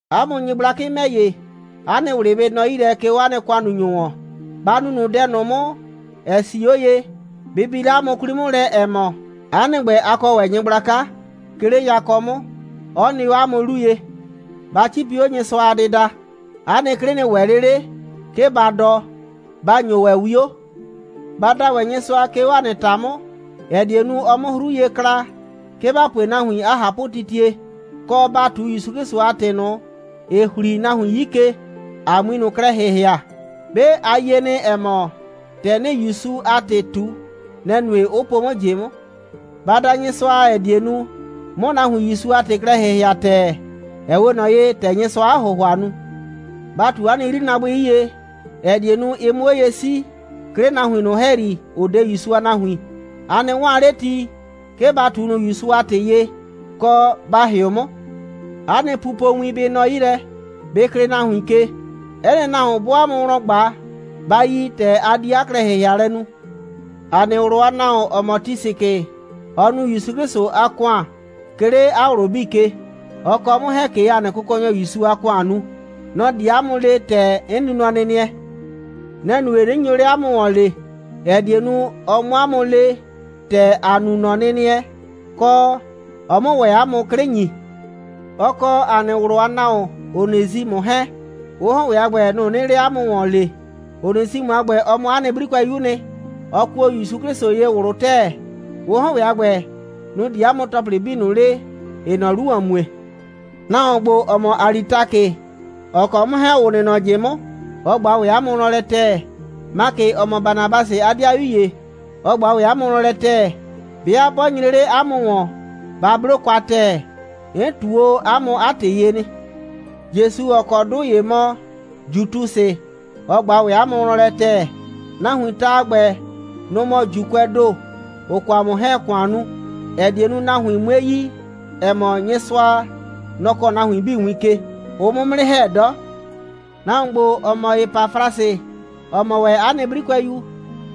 'A mʋ nyɩgblakɩ ‑mɛ ‑ye, 'a nɩ ꞊wlɩ bɩ nɔ 'yi lɛ, 'ke 'o 'a nɩ ‑kʋannunyʋ ‑wɔn. Ba nu ꞊nʋ dɛ ꞊nʋ 'mʋ, ‑ɛ 'sii 'o ye. Bɩ bi 'le 'a mʋ 'kwli 'mʋ lɛ, ‑ɛ mɔ, 'a nɩ ‑gbɛ, a kɔ ‑wɛ Nyɩgblaka, 'ke 'le yakɔ 'mʋ, 'ɔ nɩ 'o 'a mʋ 'lu ye. Ba 'cipi 'o Nyɩsʋa a dɩda. 'A nɩ 'klɩ nɩ ‑wɛ 'le 'le, 'ke ba dɔ. Ba ‑nyo ‑wɛ 'wio. Ba da ‑wɛ Nyɩsʋa, 'ke 'o ‑a nɩ ‑ta 'mʋ, ‑ɛ die nu, ɔ 'mʋ 'hru ye kla, 'ke ‑ba pue nahuin 'a ꞊hapʋtitie, kɔ, ‑ba ꞊tu ‑Yusu 'Klɩsʋ a ‑tɩ ꞊nʋ, ‑ɩ ‑hli nahuin 'yi ke, ‑a 'mui ꞊nʋ klɛ ‑hɩhɩa. 'Be a yie nɩ, ‑ɛ mɔ, ‑tɛ 'nɩɩ ‑Yusu a ‑tɩ ꞊tu, nɛ‑ nue, 'ʋ po 'mʋ ꞊jɩ 'mʋ. Ba da Nyɩsʋa, ‑ɛ die nu, 'mʋ nahuin ‑Yusu a ‑tɩ klɛ ‑hɩhɩa ‑tɛɛ, ‑ɛ 'we ꞊nɔ ye, ‑tɛ Nyɩsʋaa 'a ‑hʋhʋa nu. Ba ꞊tu 'a nɩ 'yrinaabʋɩ 'yie, ‑ɛ die nu, ɩ 'mʋ 'o ye 'sii, 'ke 'le nahuin ꞊nʋ ‑hɛyri, ‑ʋ 'de ‑Yusu a nahuin. A nɩ 'waan 'le ti, 'ke ba ꞊tu ꞊nʋ ‑Yusu a ‑tɩ ye, kɔ, ba ‑hɩʋ 'mʋ. 'A nɩ pupowin bɩ nɔ 'yi lɛ. Bɩ klɩɩ nahuin ke. 'Ɛ nɩ nahuon, 'bɔɔ 'a mʋ wlɔn ꞊gba, ba yi ‑tɛ a di 'a klɛ‑hɩhɩalɛ nu. ‑A nɩ ꞊wlʋ a nahuon, ‑ɔ mɔ Tisikɩ, ɔɔ nu ‑Yusu 'Klɩsʋ a ‑kʋan, 'ke 'le 'a ꞊wlʋ 'bii ke. Ɔ kɔ 'mʋ 'hɛɛn ꞊ke ‑a nɩ Kʋkɔnyɔ ‑Yusu a ‑kʋan nu. Nɔ‑ di 'a mʋ le, ‑tɛ 'n nu nɔnɩnɩɛ. Nɛ‑ nue, 'nɩ nyo 'le 'a mʋ ‑wɔn lee, ‑ɛ die nu, ɔ 'mʋ 'a mʋ le, ‑tɛ ‑a nu nɔnɩnɩɛ, kɔ, ɔ 'mʋ ‑wɛ 'a mʋ 'klɩ ‑nyi. Ɔ kɔ ‑a nɩ ꞊wlʋ a nahuon Onesimʋ 'hɛɛn, ʋ 'hɔn ‑wɛ a ‑gbɛ, nʋ‑ 'nɩɩ 'le 'a mʋ ‑wɔn lee. Onesimʋ a ‑gbɛ, ɔ mɔ 'a nɩ 'brikʋɛyu'u nɩ. Ɔ kuo ‑Yusu 'Klɩsʋ ye ꞊wlʋ ‑tɛɛ. Ʋ 'hɔn ‑wɛ a ‑gbɛ, nʋ‑ di 'a mʋ ‑tɔplɩ 'bii ꞊nʋ le, ‑ɩɩ nɔ 'lu ‑wɔn mue. Nahuon ‑gbo, ‑ɔ mɔ Alitakɩ, ‑ɔ kɔ 'mʋ 'hɛɛn, ‑ʋ nɩ nɔ ꞊jɩ 'mʋ, ɔ ꞊gba ‑wɛ 'a mʋ wlɔn lɛ ‑tɛɛ. Makɩ, ‑ɔ mɔ Banabasɩ a 'dɩayu ‑ye, ɔ ꞊gba ‑wɛ 'a mʋ wlɔn lɛ ‑tɛɛ. 'Bɩa 'bɔ nyre 'le 'a mʋ ‑wɔn, ba 'blo kwa ‑tɛɛ. 'N ꞊tu o 'a mʋ 'a ‑tɩ ye nɩ. Jesu, ‑ɔ kɔ 'dʋ ‑ye mɔ Jutusɩ, ɔ ꞊gba ‑wɛ 'a mʋ wlɔn lɛ ‑tɛɛ. Nahuiin ta a ‑gbɛ, nʋ‑ mɔ ‑Juukʋɛɛ ‑do, ‑ʋ kɔ 'mʋ 'hɛɛn‑ ‑kʋan nu, ‑ɛ die nu, nahuin 'mue yi, ‑ɛ mɔ, Nyɩsʋa, nɔ‑ kɔɔ nahuin 'bii win ke. Ʋʋ 'mʋ 'mʋ 'nɩ ‑hɛ 'dɔ. Nahuon ‑gbo, ‑ɔ mɔ Epafrasɩ, ‑ɔ mɔ ‑wɛ 'a nɩ 'brikʋɛyu,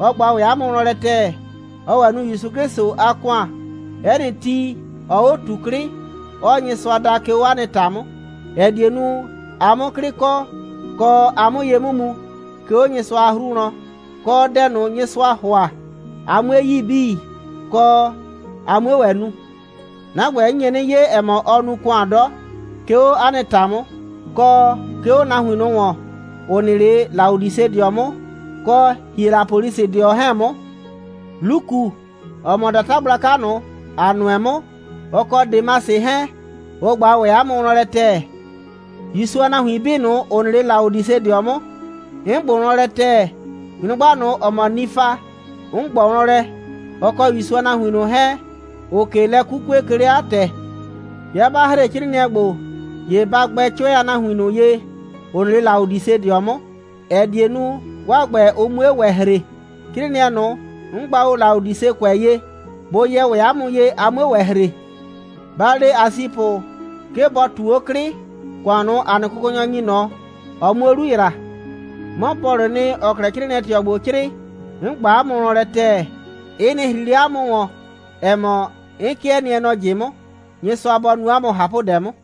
ɔ ꞊gba ‑wɛ 'a mʋ wlɔn lɛ ‑tɛɛ. Ɔɔ ‑wɛ nu ‑Yusu 'Klɩsʋ a ‑kʋan. 'Ɛ nɩ ti, ɔɔ 'o ꞊tu 'klɩ, 'ɔɔ Nyɩsʋa da, 'ke 'o 'a nɩ ‑ta 'mʋ, ‑ɛ die nu, a 'mʋ 'klɩ kɔ, kɔ, a 'mʋ ye 'mʋ mu, 'ke 'o Nyɩsʋa a 'hru wlɔn, kɔ, dɛ ꞊nʋ, Nyɩsʋaa ‑hʋa, a 'mue yi 'bii, kɔ, a 'mue ‑wɛ nu. 'Na ‑gbɛ, 'n nye 'nɩ 'ye, ‑ɛ mɔ, ɔɔ nu ‑kʋan 'dɔ, 'ke 'o 'a nɩ ‑ta 'mʋ, kɔ 'ke 'o nahuin ꞊nʋ ‑wɔn, ‑ʋ nɩ 'le Laodisedɩɔ 'mʋ kɔ Hielapolisɩdɩɔ 'hɛɛn 'mʋ. Luku, ‑ɔ mɔ ‑data gblaka ꞊nʋ, ‑a nʋɛ 'mʋ, ɔ kɔ Demasɩ 'hɛɛn, ʋ ꞊gba ‑wɛ 'a mʋ wlɔn lɛ ‑tɛɛ. ‑Yusu a nahuin 'bii ꞊nʋ, ‑ʋ nɩ 'le Laodisedɩɔ 'mʋ, 'n ꞊gbʋ wlɔn lɛ ‑tɛɛ. Nyrʋgba ꞊nʋ, ‑ɔ mɔ Nifa, 'n ꞊gbɔ wlɔn lɛ, ɔ kɔ ‑Yusu a nahuin ꞊nʋ 'hɛɛn, ‑ʋʋ ꞊ke lɛ 'kukue, 'ke 'le 'a ‑tɛ. 'Bɩa 'ba ‑hre 'crɩɩnɩɛ ‑gbo, ‑ye ba gbɛ 'cʋɛ a nahuin ꞊nʋ ye, ‑ʋ nɩ 'le Laodisedɩɔ 'mʋ, ‑ɛ die nu, 'waa ‑gbɛ, ʋ 'mue ‑wɛ ‑hre. 'Crɩɩnɩɛ ꞊nʋ, 'n gba o Laodisekʋɛ ye, bʋ yɛ ‑wɛ 'a mʋ ye, a 'mue ‑wɛ ‑hre. Ba le Asipʋ, 'ke bɔ ꞊tu 'o 'klɩ, ‑kʋan ꞊nʋ, ‑a nɩ Kʋkɔnyɔ ‑nyi ꞊nɔ, ɔ 'muo 'lu ‑yra. 'Mɔ Pɔlʋʋ nɩ, ‑ɔɔ 'klɛɛ 'crɩɩnɩɛ꞊tɩɔ ‑gbo 'crɩɩ: 'N ꞊gba 'a mʋ wlɔn lɛ ‑tɛɛ. Ɩ nɩ ‑hri 'le 'a mʋ ‑wɔn, ‑ɛ mɔ, 'n 'kɩɛ nɩɛ nɔ ꞊jɩ 'mʋ. Nyɩsʋa bɔ nu 'a mʋ ꞊hapʋdɛ 'mʋ.